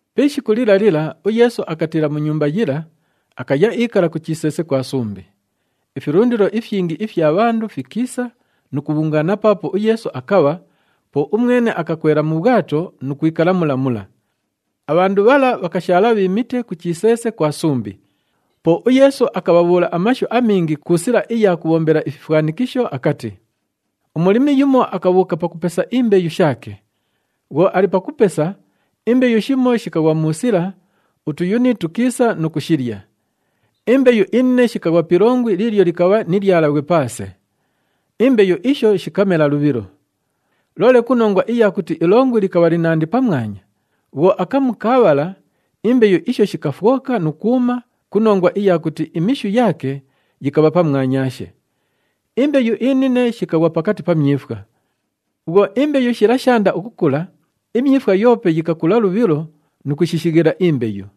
Pi ishiku lila lila, uYeesu akatiila mu nyumba yila, akaya iikala ku chiseese kwa sumbi. Ifilundilo ifyingi ifya bhandu fikiisa nu kubhungaana paapo uYeesu akabha, po umwene akakwela mu bhwato nu kwikala mula mula. Abhandu bhala bhakashaala bhiimite ku chiseese kwa sumbi. Po uYeesu akabhabhuula amashu amingi ku sila iya kubhombela ififwanikisho akati, “Umulimi yumo akabhuuka pakupesa imbeyu shaake. Bhwo ali pakupesa, imbeyu shimo shikaghwa mu sila, utuyuni tukiisa nu kushilya. Imbeyu inine shikaghwa pi ilongwi liilyo likabha ni lyalabhwe paase. Imbeyu isho shikamela lubhilo. Loole ku nongwa iya kuti ilongwi likabha linandi pamwanya, bhwo akamu kaabhala, imbeyu isho shikafwoka nu kwuma ku nongwa iya kuti imishu yaake yikabha pamwanyaashe. Imbeyu inine shikaghwa pakati pa myifwa. Bhwo imbeyu shila shaanda ukukula, imyifwa yoope yikakula lubhilo nu kushishighila imbeyu.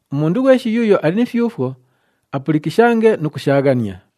Umundu ghweshi yuuyo ali ni fyufwo, apulikishange nu kushaaghania!”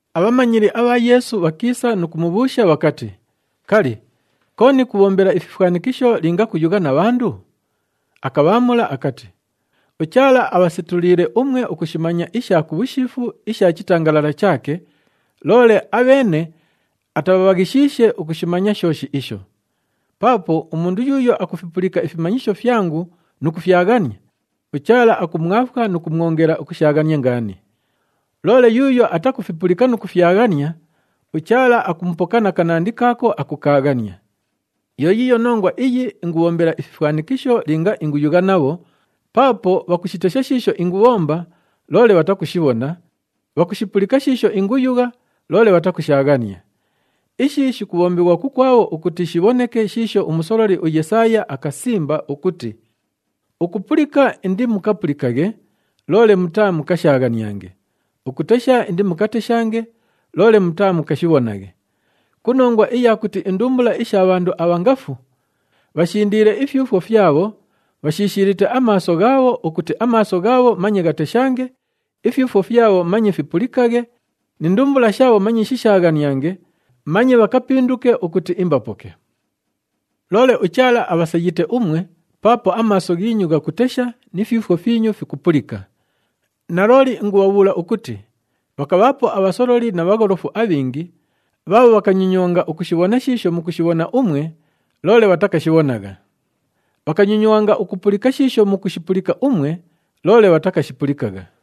Abhamanyili abha Yeesu bhakiisa nu kumubhuusha bhakati, “Kali, kooni kubhombela ififwanikisho linga kuyugha na bhandu?” Akabhaamula akati, “UChaala abhasetuliile umwe ukushimanya isha ku bhushiifu isha chitangalala chaake, loole abheene atabhabhaghishiishe ukushimanya shooshi isho. Paapo umundu yuuyo akufipulika ifimanyisho fyangu nu kufyaghania, uChaala akumwafwa nu kumwongela ukushaaghania ngaani. Loole yuuyo atakufipulika nu kufyaghania, uChaala akumupoka na kanandi kaako akukaaghania. Yo yiiyo nongwa iyi ingubhombela ififwanikisho linga inguyugha nabho, paapo bhakushitesha shiisho ingubhomba, loole bhatakushibhona, bhakushipulika shiisho inguyugha, loole bhatakushaaghania. Ishi shikubhombighwa kukwabho ukuti shibhoneke shiisho umusololi uYesaaya akasimba ukuti, ‘Ukupulika indimukapulikaghe, loole mutaamukashaaghaniange. Ukutesha indimukateshange, loole mutaamukashibhonaghe. Ku nongwa iya kuti indumbula isha bhandu abha ngafu, bhashindiile ifyufwo fyabho, bhashishiilite amaaso ghaabho, ukuti amaaso ghaabho manye ghateshange, ifyufwo fyabho manye fipulikaghe ni ndumbula shaabho manye shishaaghaniange, manye bhakapinduke ukuti imbapoke.’ “Loole uChaala abhasayite umwe, paapo amaaso ghiinyu ghakutesha ni fyufwo fyinyu fikupulika. Nalooli ingubhabhuula ukuti bhakabhaapo abhasololi na bhagholofu abhingi bhaabho bhakanyonywanga ukushibhona shiisho mukushibhona umwe, loole bhatakashibhonagha. Bhakanyonywanga ukupulika shiisho mukushipulika umwe, loole bhatakashipulikagha.”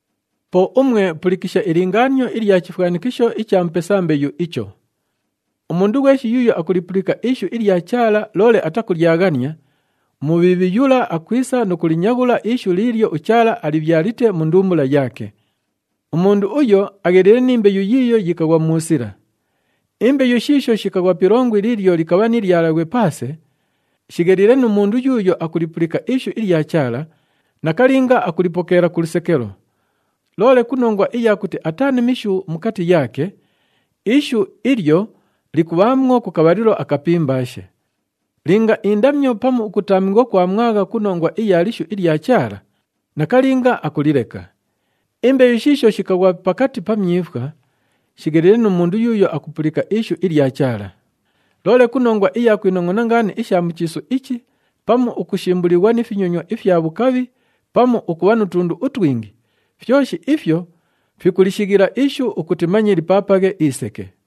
“Po umwe pulikisha ilingaanio ilya chifwanikisho icha mupesa mbeyu icho. Umundu ghweshi yuuyo akulipulika ishu ilya Chaala loole atakulyaghania, uMubhiibhi yula akwisa nu kulinyaghula ishu liilyo uChaala alibhyalite mu ndumbula yaake. Umundu uyo agheliile ni mbeyu yiiyo yikaghwa mu sila. Imbeyu shiisho shikaghwa pi ilongwi liilyo likabha ni lyalabhwe paase, shigheliile nu mundu yuuyo akupulika ishu ilya Chaala, nakalinga akulipokeela ku lusekelo. Loole ku nongwa iya kuti ataa ni mishu mukati yaake, ishu ilyo likubhaamwo ku kabhalilo akapimbaashe. Linga indamyo pamu ukutaamighwa kwamwagha ku nongwa iya lishu ilya Chaala, nakalinga akulileka. Imbeyu shiisho shikaghwa pakati pa myifwa, shigheliile nu mundu yuuyo akupulika ishu ilya Chaala. Loole ku nongwa iya kwinongʼona ngaani isha mu chiisu ichi pamu ukushimbulighwa ni finyonywa ifya bhukabhi pamu ukubha nu tundu utwingi, fyoshi ifyo fikulishighila ishu ukuti manye lipaapaghe iseke.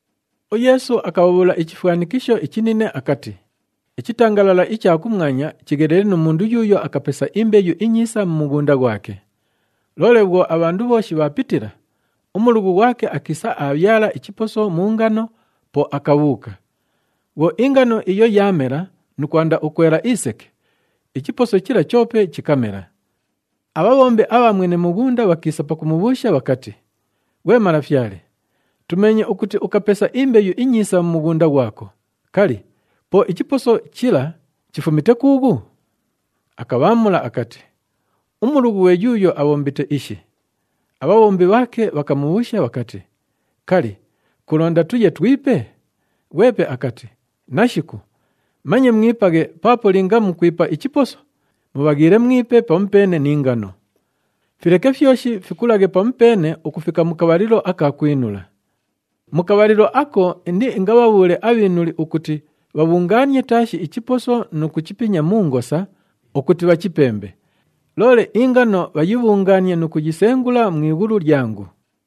UYeesu akabhabhuula ichifwanikisho ichinine akati, “Ichitangalala icha kumwanya chigheliile nu mundu yuuyo akapesa imbeyu inyiisa mu mughunda ghwake. Loole bhwo abhandu bhooshi bhaapitila, umulughu ghwake akiisa aabhyala ichiposo mu ngano, po akabhuuka. Bhwo ingano iyo yaamela nu kwanda ukwela iseke, ichiposo chila choope chikamela. Abhabhombi abha mwene mughunda bhakiisa pakumubhuusha bhakati, ‘Ghwe malafyale, tumeenye ukuti ukapesa imbeyu inyiisa mu mughunda ghwako, kali, po ichiposo chila chifumite kuughu?’ Akabhaamula akati, ‘Umulughu ghwe yuuyo abhombite ishi.’ Abhabhombi bhaake bhakamubhuusha bhakati, ‘Kali, kulonda tuye twipe?’ Ghwepe akati, ‘Nashiku, manye mwipaghe paapo linga mukwipa ichiposo, mubhaghiile mwipe pamupeene ni ngano. Fileke fyoshi fikulaghe pamupeene ukufika mu kabhalilo aka kwinula. Mu kabhalilo ako, indiingabhabhuule abhiinuli ukuti bhabhungaanie taashi ichiposo nu kuchipinya mu ngosa ukuti bhachipembe. Loole ingano bhayibhungaanie nu kuyisengula mu ighulu lyangu.’”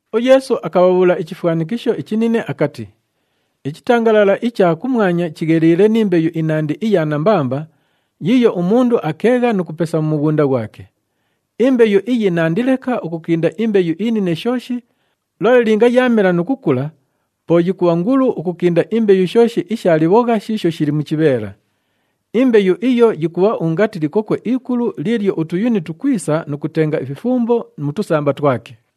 UYeesu akabhabhuula ichifwanikisho ichinine akati, “Ichitangalala icha kumwanya chigheliile ni mbeyu inandi iya nambamba yiiyo umundu akeegha nu kupesa mu mughunda ghwake. Imbeyu iyi nandi leka ukukinda imbeyu inine shooshi, loole linga yaamela nu kukula po yikubha ngulu ukukinda imbeyu shooshi isha libhogha shiisho shili mu chibheela. Imbeyu iyo yikubha ungati likokwe ikulu liilyo utuyuni tukwisa nu kutenga ififumbo mu tusamba twake.”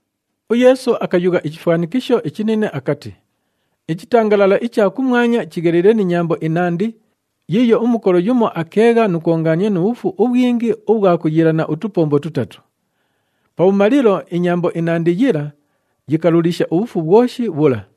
UYeesu akayugha ichifwanikisho ichinine akati, “Ichitangalala icha kumwanya chigheliile ni nyambo inandi yiiyo umukolo yumo akeegha nu kwongaania nu bhufu ubhwingi ubhwa kuyiilana utupombo tutatu. Pabhumalilo, inyambo inandi yila yikalulisha ubhufu bhwoshi bhula.”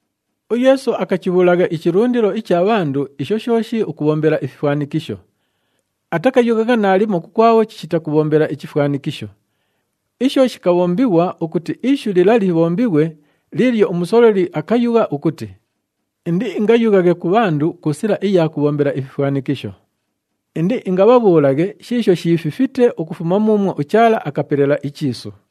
UYeesu akachibhuulagha ichilundilo icha bhandu isho shooshi ukubhombela ififwanikisho. Atakayughagha naalimo kukwabho chishita kubhombela ichifwanikisho. Isho shikabhombighwa ukuti ishu lila libhombighwe liilyo umusololi akayugha ukuti, “Indiingayughaghe ku bhandu ku sila iya kubhombela ififwanikisho. Indiingabhabhuulaghe shiisho shiififite ukufuma muumwo uChaala akapelela ichiisu.”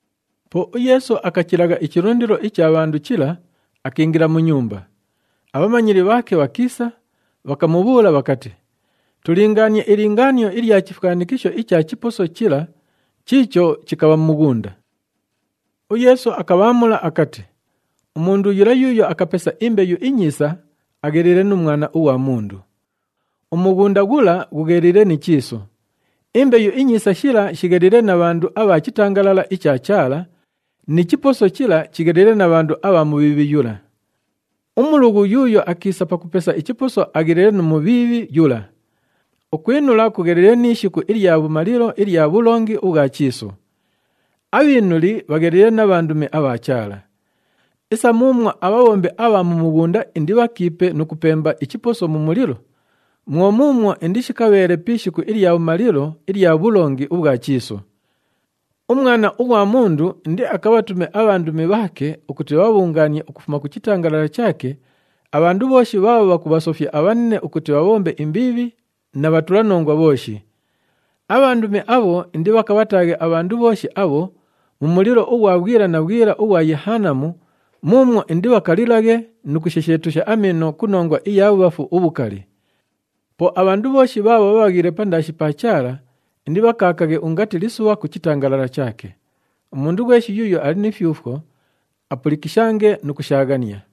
Po uYeesu akachilagha ichilundilo icha bhandu chila, akiingila mu nyumba. Abhamanyili bhaake bhakiisa, bhakamubhuula bhakati, “Tulingaanie ilingaanio ilya chifwanikisho icha chiposo chila chiicho chikabha mu mughunda.” UYeesu akabhaamula akati, “Umundu yula yuuyo akapesa imbeyu inyiisa agheliile nu Mwana ughwa Mundu. Umughunda ghula ghugheliile ni chiisu, imbeyu inyiisa shila shigheliile na bhandu abha chitangalala icha Chaala ni chiposo chila chigheliile na bhandu abha Mubhiibhi yula. Umulughu yuuyo akiisa pakupesa ichiposo agheliile nu Mubhiibhi yula. Ukwinula kugheliile ni ishiku ilya bhumalilo ilya bhulongi ubhwa chiisu. Abhiinuli bhagheliile na bhandumi abha Chaala. Isa muumwo abhabhombi abha mu mughunda indibhakiipe nu kupemba ichiposo mu mulilo, mwo muumwo indishikabheele pi ishiku ilya bhumalilo ilya bhulongi ubhwa chiisu. UMwana ughwa Mundu indiakabhatume abhandumi bhaake ukuti bhabhabhungaanie ukufuma ku chitangalala chaake abhandu bhooshi bhaabho bhakubhasofya abhanine ukuti bhabhombe imbiibhi na bhatulanongwa bhooshi. Abhandumi abho indibhakabhataaghe abhandu bhooshi abho mu mulilo ughwa bhwila na bhwila ughwa Yehanamu muumwo indibhakalilaghe nu kushesheetusha amiino ku nongwa iya bhubhafu ubhukali. Po abhandu bhooshi bhaabho bhabhaghile pandaashi pa Chaala, indibhakaakaghe ungati lisubha ku chitangalala chaake. Umundu ghweshi yuuyo ali ni fyufwo, apulikishange nu kushaaghania!”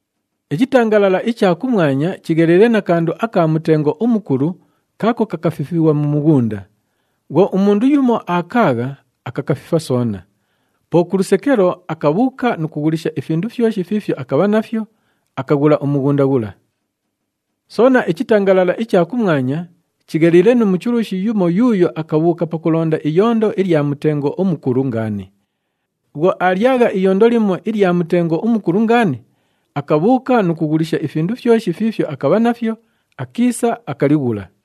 “Ichitangalala icha kumwanya chigheliile na kandu aka mutengo umukulu kaako kakafifighwa mu mughunda. Bhwo umundu yumo aakaagha, akakafifa soona. Po ku lusekelo, akabhuuka nu kughulisha ifindu fyoshi fiifyo akabha nafyo, akaghula umughunda ghula. “Soona, ichitangalala icha kumwanya chigheliile nu muchulushi yumo yuuyo akabhuuka pakulonda iyondo ilya mutengo umukulu ngaani. Bhwo aalyagha iyondo limo ilya mutengo umukulu ngaani, akabhuuka nu kughulisha ifindu fyoshi fiifyo akabha nafyo, akiisa, akalighula.”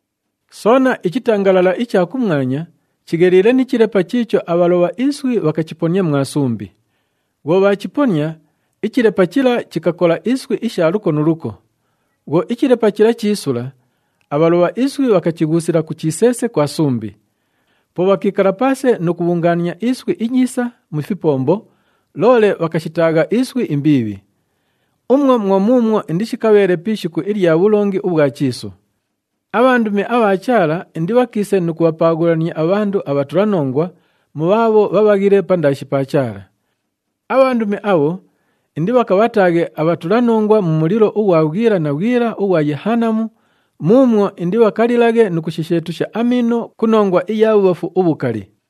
“Soona, ichitangalala icha kumwanya chigheliile ni chilepa chiicho abhalobha iswi bhakachiponia mwa sumbi. Bhwo bhaachiponia, ichilepa chila chikakola iswi isha luko nu luko. Bhwo ichilepa chila chiisula, abhalobha iswi bhakachighuusila ku chiseese kwa sumbi. Po bhakiikala paase nu kubhungaania iswi inyiisa mu fipombo, loole bhakashitaagha iswi imbiibhi. Umwo mwo muumwo indishikabheele pi ishiku ilya bhulongi ubhwa chiisu. Abhandumi abha Chaala indibhakiise nu kubhapaaghulania abhandu abhatulanongwa mu bhaabho bhabhaghile pandaashi pa Chaala. Abhandumi abho indibhakabhataaghe abhatulanongwa mu mulilo ughwa bhwila na bhwila ughwa Yehanamu muumwo indibhakalilaghe nu kushesheetusha amiino ku nongwa iya bhubhafu ubhukali.”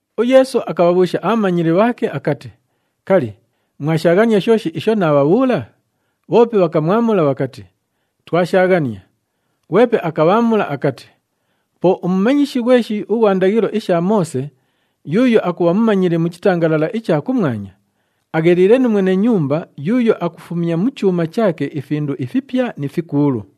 UYeesu akabhabhuusha abhamanyili bhaake akati, “Kali, mwashaaghania shooshi isho naabhabhuula?” Bhoope bhakamwamula bhakati, “Twashaaghania.” Ghwepe akabhaamula akati, “Po umumanyishi ghweshi ughwa ndaghilo isha Moose yuuyo akubha mumanyili mu chitangalala icha kumwanya, agheliile nu mwene nyumba yuuyo akufumya mu chuuma chaake ifindu ifipya ni fikuulu.”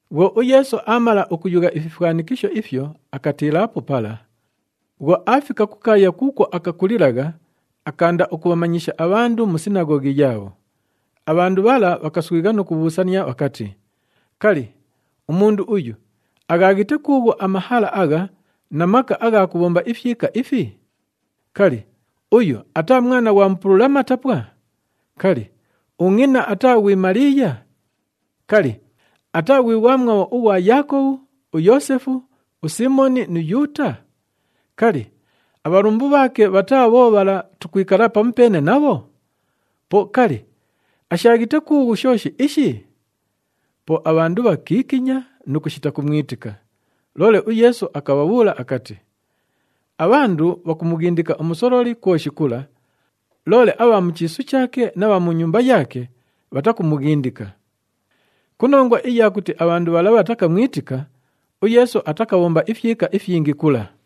Bhwo uYeesu aamala ukuyugha ififwanikisho ifyo, akatiilaapo pala. Bhwo aafika ku kaaya kuukwo akakulilagha, akaanda ukubhamanyisha abhandu mu sinaghoghi yaabho. Abhandu bhala bhakaswigha nu kubhuusania bhakati, “Kali, umundu uyu aghaaghite kuughu amahala agha na maka agha kubhomba ifyika ifi? Kali, uyu ataa mwana ghwa mupulula matapwa? Kali, ungʼina ataa ghwi Maliiya? Kali, ataa ghwi ghwamwabho ughwa Yaakobhu, uYoosefu, uSiimoni nu Yuuta? Kali, abhalumbu bhaake bhataa bho bhala tukwikala pamupeene nabho? Po kali, ashaaghite kuughu shooshi ishi?” Po abhandu bhakiikinya nu kushita kumwitika. Loole uYeesu akabhabhuula akati, “Abhandu bhakumughindika umusololi kwoshi kula, loole abha mu chiisu chaake na bha mu nyumba yaake bhatakumughindika.” Ku nongwa iya kuti abhandu bhala bhatakamwitika, uYeesu atakabhomba ifyika ifyingi kula.